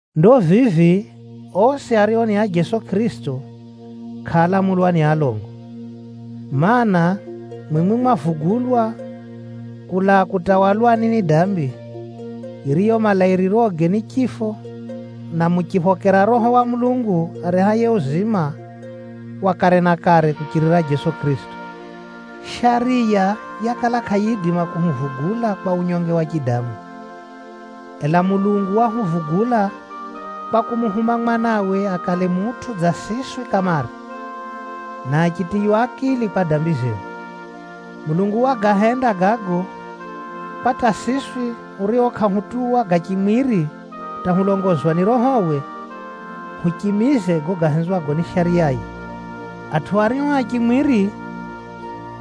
Ndo vivi osi ario ni a Jeso Kʼirisito, kʼaalamulwa ni alongo. Maana, mwimwi mwavugulwa Nakala zinjine zinaamba: Mimi návugulwa. kulaa kutawalwani ni dambi, yiriyo malairiroge ni chifo, na muchiphokera Roho wa Mulungu arehaye uzima wa kare na kare kuchirira Jeso Kʼirisito. Shariya yakala kʼayiidima kuhuvugula kwa unyonge wa chidamu, ela Mulungu wahuvugula kwa kumuhuma Mwanawe akale mutʼu dza siswi kamare, na achitiywa akili kwa dambi zehu. Mulungu Wagahenda gago, kwa hata siswi hurio kʼahutuwa ga chimwiri hata hulongozwa ni Rohowe, huchimize gago gahenzwago ni Shariyaye. Atʼu ario a chimwiri,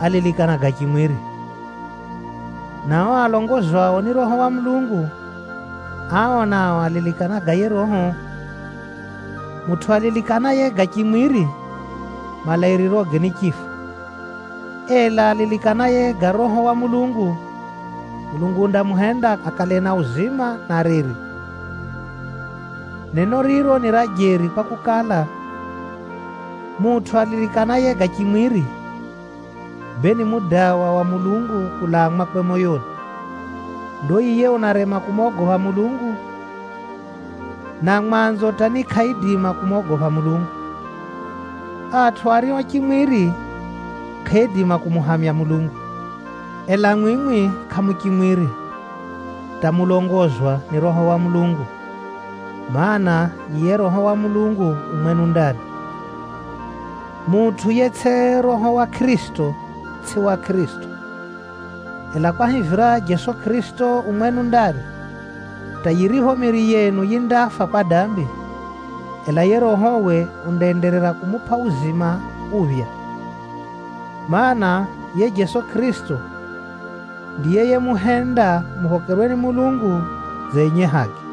alilikana ga chimwiri, na o alongozwao ni Roho wa Mulungu, ao nao alilikana ga yiye Roho. Mutʼu alilikanaye ga chimwiri, malairiroge ni chifo. Ela alilikanaye ga Roho wa Mulungu, Mulungu undamuhenda akale na uzima na reri. Neno riro ni ra jeri kwakukala, mutʼu alilikanaye ga chimwiri, bee ni mudawa wa Mulungu kulaa mwakwe moyoni. Ndo yiye unarema kumogopha Mulungu, na mwanzo hata ni kʼaidima kumogopha Mulungu. Atʼu ario a chimwiri, kʼaaidima kumuhamya Mulungu. Ela mwimwi kʼamu chimwiri, hata mulongozwa ni Roho wa Mulungu, mana, yiye Roho wa Mulungu u mwenu ndani. Mutʼu yetsʼi Roho wa Kʼirisito, tsʼi wa Kʼirisito. Ela kwahivira Jeso Kʼirisito u mwenu ndani, hata yiripho miiri yenu yindafa kwa dambi, ela yiye Rohowe undaenderera kumupʼa uzima uphya. Maana, yiye Jeso Kʼirisito ndiye yemuhenda muphokerwe ni Mulungu dza enye haki.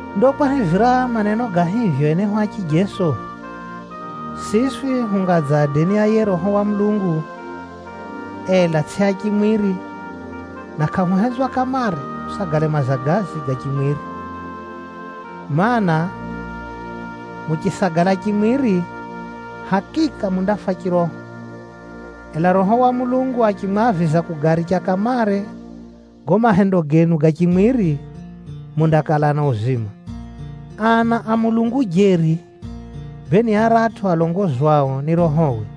Ndo kwahivira maneno ga hivyo enehu a chijeso, siswi hunga dza adeni a yiye Roho wa Mulungu, ela tsʼi a chimwiri, na kʼahuhenzwa kamare husagale mazagazi ga chimwiri. Maana, muchisagala chimwiri, hakika mundafa chiroho. Ela Roho wa Mulungu achimwaviza kugaricha kamare gago mahendo genu ga chimwiri, mundakala na uzima. Ana a Mulungu jeri, bee ni aratʼu alongozwao ni Rohowe.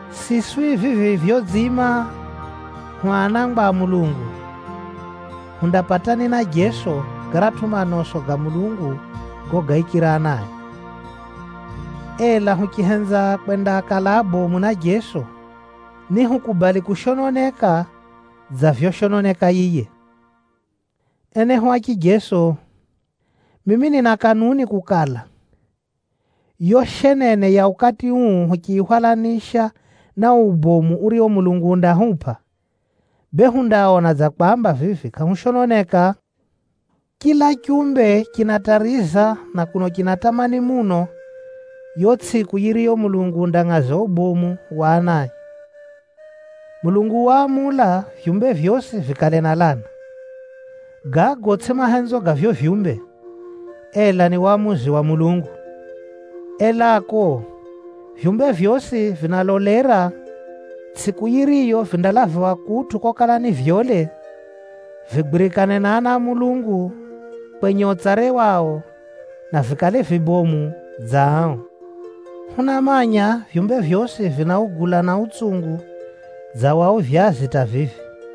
Siswi vivi vyodziima hu anangwa a Mulungu, hundapatani na Kʼirisito garatʼu manoso ga Mulungu gogaikira anae. Ela huchihenza kwendakala abomu na Jeso, nihukubali kushononeka dza vyoshononeka yiye. Enehu a chijeso, mimi nina kanuni kukala, yo shenene ya ukati uu huchiyihwalanisha na o ubomu urio Mulungu undahupʼa, bee hundaona dza kwamba vivi kʼahushononeka. Chila chumbe chinatariza na kuno chinatamani muno yo tsʼiku yiriyo Mulungu undangʼaza ubomu wa anae. Mulungu waamula vyumbe vyosi vikale na lana. Gago tsʼigo mahenzo ga vivyo vyumbe, ela ni wamuzi wa Mulungu. Elako, vyumbe vyosi vinalolera tsʼiku yiriyo vindalaviwa kutʼu kokala nivyole, vigwirikane na ana a Mulungu kwenye utsare wao, na vikale vibomu dza ao. Hunamanya vyumbe vyosi vinaugula na utsungu dza wa uvyazi hata vivi.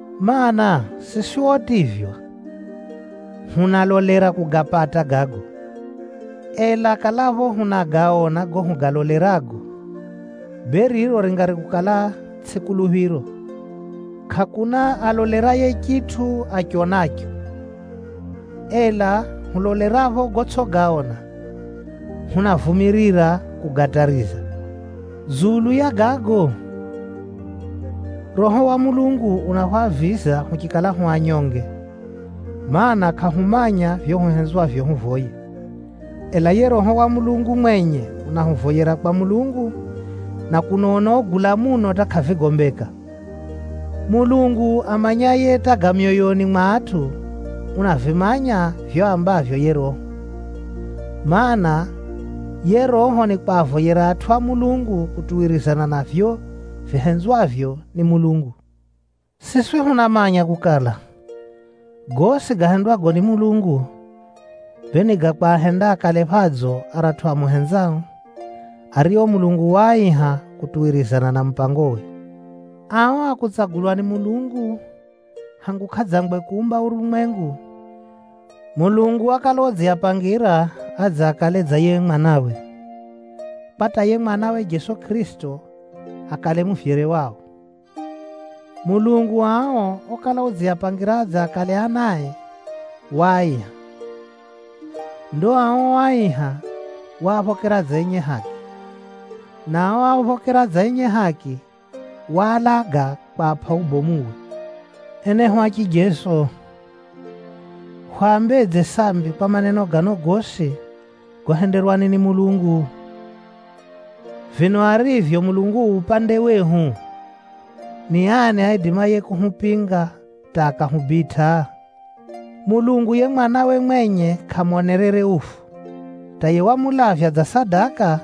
Maana, siswi otivywa, hunalolera kugapata gago. Ela kalapho hunagaona gago hugalolerago, bee riro ringari kukala tsʼi kuluphiro. Kʼakuna aloleraye chitʼu achionacho. Ela hulolerapho gotsʼigaona, hunavumirira kugatariza. Dzulu ya gago, Roho wa Mulungu unahwaviza huchikala hu anyonge, mana, kʼahumanya vivyo huhenzwavyo huvoye. Ela yiye Roho wa Mulungu mwenye unahuvoyera kwa Mulungu, na kuno unaugula muno hata kʼavigombeka. Mulungu amanyaye hata ga myoyoni mwa atʼu, unavimanya vivyo aambavyo yiye Roho. Maana, yiye Roho nikwavoyera atʼu a Mulungu kutuwirizana na vivyo vihenzwavyo ni Mulungu. Siswi hunamanya kukala, gosi gahendwago ni Mulungu, bee ni ga kwahenda akale phadzo aratʼu amuhenzao, ario Mulungu waaiha kutuwirizana na mupangowe. Ao a kutsagulwa ni Mulungu hangu kʼadzangwe kuumba urumwengu, Mulungu wakala udziapangira adze akale dza yiye Mwanawe, kwa hata yiye Mwanawe Jeso Kʼirisito akale muvyere wao. Mulungu ao okala udziapangira adze akale anae, waaiha. Ndo ao oaiha, waaphokera dza enye haki, na ao oaphokera dza enye haki, waalaga kwapʼa ubomuwe. Enehu a chijeso, hwambedze sambi kwa maneno gano gosi gohenderwani ni Mulungu? Vino arivyo Mulungu u upande wehu, ni ani aidimaye kuhupinga hata akahubitʼa? Mulungu yiye Mwanawe mwenye kʼamonerere ufu, hata yiye wamulavya dza sadaka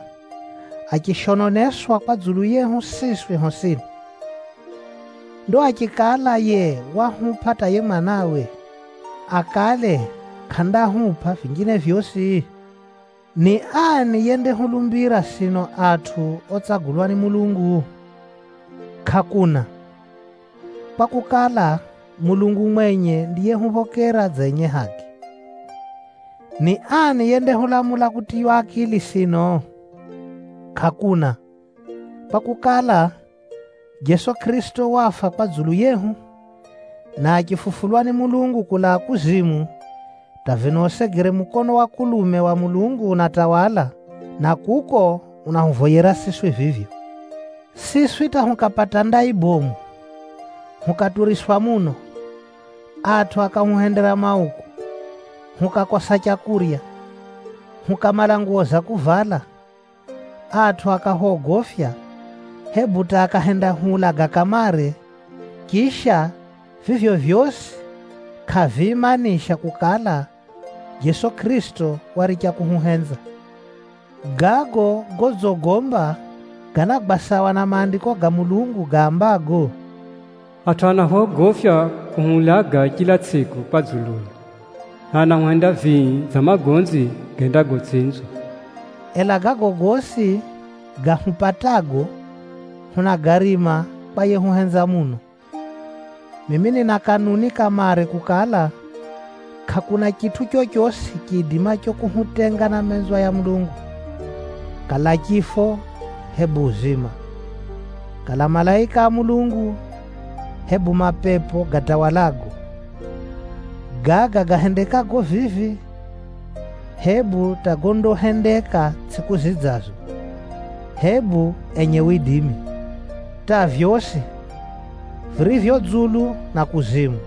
achishononeswa kwa dzulu yehu siswi hosini. Ndo achikala yiye wahupʼa hata yiye Mwanawe, akale kʼandahupʼa vinjine vyosi? Ni ani yendahulumbira sino atʼu otsagulwa ni Mulungu? Kʼakuna, kwakukala, Mulungu mwenye ndiyehuphokera dza enye haki. Ni ani yendahulamula kutiywa akili sino? Kʼakuna, kwakukala, Jeso Kʼirisito wafa kwa dzulu yehu, na achifufulwa ni Mulungu kulaa kuzimu, hata vino usegere mukono wa kulume wa Mulungu unatawala, na kuko unahuvoyera siswi vivyo. Siswi hata hukapata ndai bomu, hukaturiswa muno, atʼu akahuhendera mauku, hukakosa leu, hukamala nguwo za kuvala, atʼu akahwogofya, hebu hata akahendahuulaga kamare, chisha, vivyo vyosi kʼaviimanisha kukala, Jeso Kʼirisito waricha kuhuhenza. Gago godzigomba, ganagwa sawa na Maandiko ga Mulungu gaambago, “Sino hunaulagwa chila tsʼiku kwa dzuluyo, na anahuhenda vii dza magonzi gendagotsinzwa.” Ela gago gosi gahupatago hunagarima kwa yehuhenza muno. Mimi nina kanuni kamare kukala, kʼakuna chitʼu chochosi chiidimacho kuhutenga na menzwa ya Mulungu. Kala chifo, hebu uzima, kala malaika a Mulungu, hebu mapepo gatawalago, gaga gahendekago vivi hebu hata gondahendeka tsʼiku zidzazo, hebu enye widimi. Hata vyosi, virivyo dzulu na kuzimu,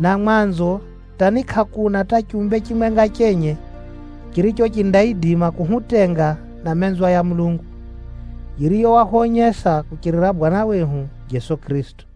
na mwanzo hata ni kʼakuna hata chumbe chimwenga chenye chiricho chindaidima kuhutenga na menzwa ya Mulungu, yiriyo wahwonyesa kuchirira Bwana wehu Jeso Kʼirisito.